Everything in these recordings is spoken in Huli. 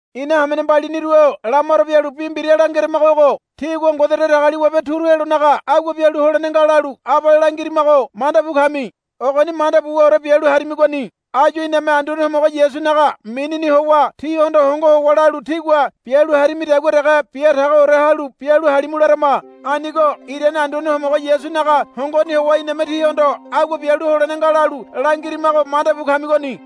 Ina hamene mbaliniru-o lamaro bialu bi mbira langeramago ogo. Tígua Ngode Datagaliwabe turu helonaga agua bialu holene nga lalu abale langirimago mandabu kami. Ogoni manda buwaore bialu harimigoni. Áyu iname Anduane Homogo Yasunaga minini howa tíhondo hongo howa lalu tígua bialu harimidagua dege bia tagoore halu bialu halimu larama. Anigo irane Anduane Homogo Yasunaga hongoni howa iname tíhondo agua bialu holene nga lalu langirimago mandabu kamigoni.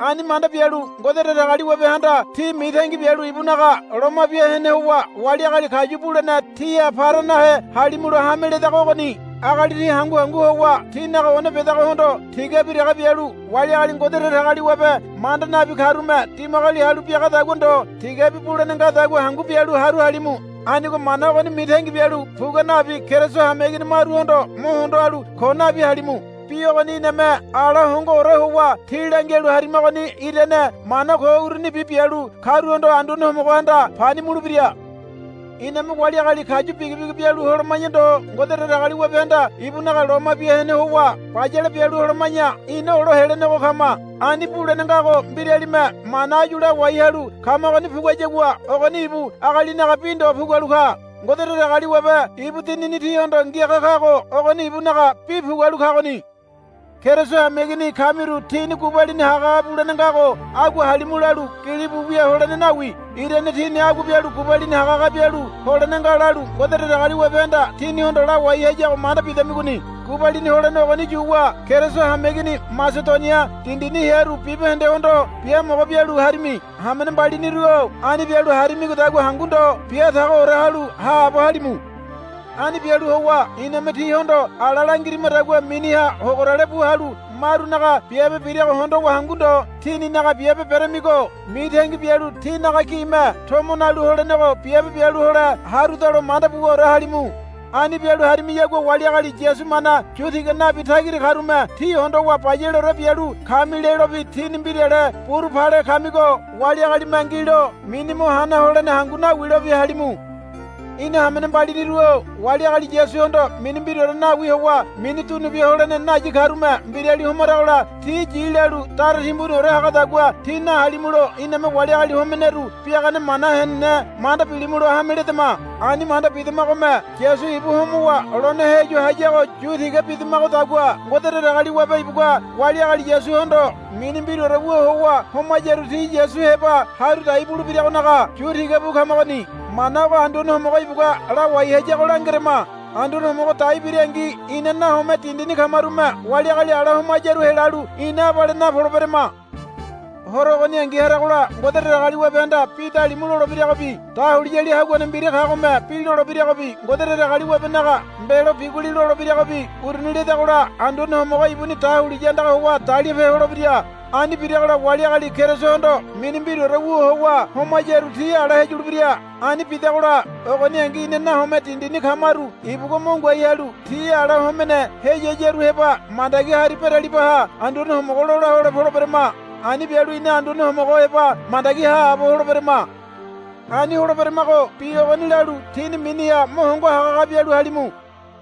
Ani manda bialu Ngode Datagaliwabehanda tí mitangi bialu ibunaga loma bia hene howa wali agali kayu bulene tíha para nahe halimulo hame ledago ogoni. Agali tí hangu hangu howa tínaga one bedagohondo tigabi dege bialu wali agali Ngode Datagaliwabe manda nabi karume dimagoli halu biagadagua ndo tigabi bulene ngadagua hangu bialu haru halimu. Anigo mana ogoni mitangi bialu pugua nabi Keriso hameigini maruhondo mo hondo halu ko nabi halimu. Bi ogoni iname ala hongoore howa tí langialu harimagoni irane mana ko urunibi bialu karuhondo Anduane Homogohanda pani mulebira. Iname wali agali kayu bigibigi bialu holoma̱ya ndo Ngode Datagaliwabehanda ibunaga loma bia hene howa bayale bialu holoma̱ya ina olo helenego kama. Ani bulene ngago mbiralime mana áyu lawai halu kamagoni puguayagua ogoni ibu agalinaga bi ndo pugualu ka. Ngode Datagaliwabe ibu Dinini tíhondo ngiaga kago ogoni ibunaga bi pugualu kagoni. Keriso hameigini kamiru tíni gubalini hagahaga bulene ngago agua halimu lalu gilibu wia holene nawi. Irane tíni agua bialu gubalini hagahaga bialu holene nga lalu Ngode Datagaliwabehanda tínihondo lawai hayago manda bidamigoni. Gubalini holene ogoni yuwa Keriso hamewaneigini Masedonia dindini hearu bibahendehondo biamogo bialu harimi. Hamene mbaliniru-o ani bialu harimigodagua hangu ndo bia tagoore halu haabo halimu. Ani bialu howa iname tíhondo ala langirimadagua miniha hogorale bu halu marunaga biabe birago hondowa hangu ndo tíninaga biabe beremigo mitangi bialu tínaga gime tomo nalu holenego biabe bialu hole harudalo manda buwaore halimu. Ani bialu harimiyagua wali agali Yasu mana yu tiga nabi tagira karume tí hondowa bayaleore bialu kami lelobi tíni mbirale buru pale kamigo wali agalime ngilo mini mo hana holene hangu nawilobi halimu. Ina hamene mbaliniru-o wali agali Yasuhondo mini mbiraore nawi howa mini dunu bia holene nayi karume mbirali homaragola ti yi lalu dara timbuniore hagadagua tí nahalimulo iname wali agali homeneru biagane mana henene manda bilimulo hame ledama. Ani manda bidamagome Yasu ibu homowa lone heyu hayago yu tiga bidamagodagua Ngode Datagaliwabe ibugua wali agali Yasuhondo mini mbiraore wu howa homayaru ti Yasu heba haru dai bulebiragonaga yu tiga bu kamagoni. Mana ogo Anduane Homogo ibugua lawai hayago langerama. Anduane Homogo dai birangi ina nahome dindini kamarume wali agali ala homayaru helalu ina abale napoleberama. Horo ogoningi haragola Ngode Datagaliwabehanda bi dalimu lolebiragobi dahuliyali haguane mbira kagome bi lolebiragobi Ngode Datagaliwabenaga mbelo biguli lolebiragobi uruni ledagola Anduane Homogo ibuni dahuliya andaga howa dalipe holebira. Ani biragola wali agali Kerisohondo mini mbiraore wu howa homayaru ti ala heyulebira. Ani bidagola ogoningi ina nahome dindini kamaru ibugua mo ngoai halu ti ala homene heyiyaru heba mandagi hari beralibaha Anduane Homogo lola hole poleberama. Ani bialu ina Anduane Homogo heba mandagi haabo holeberama. Ani holeberamago bi ogoni lalu tíni miniha mo hongo hagahaga bialu halimu.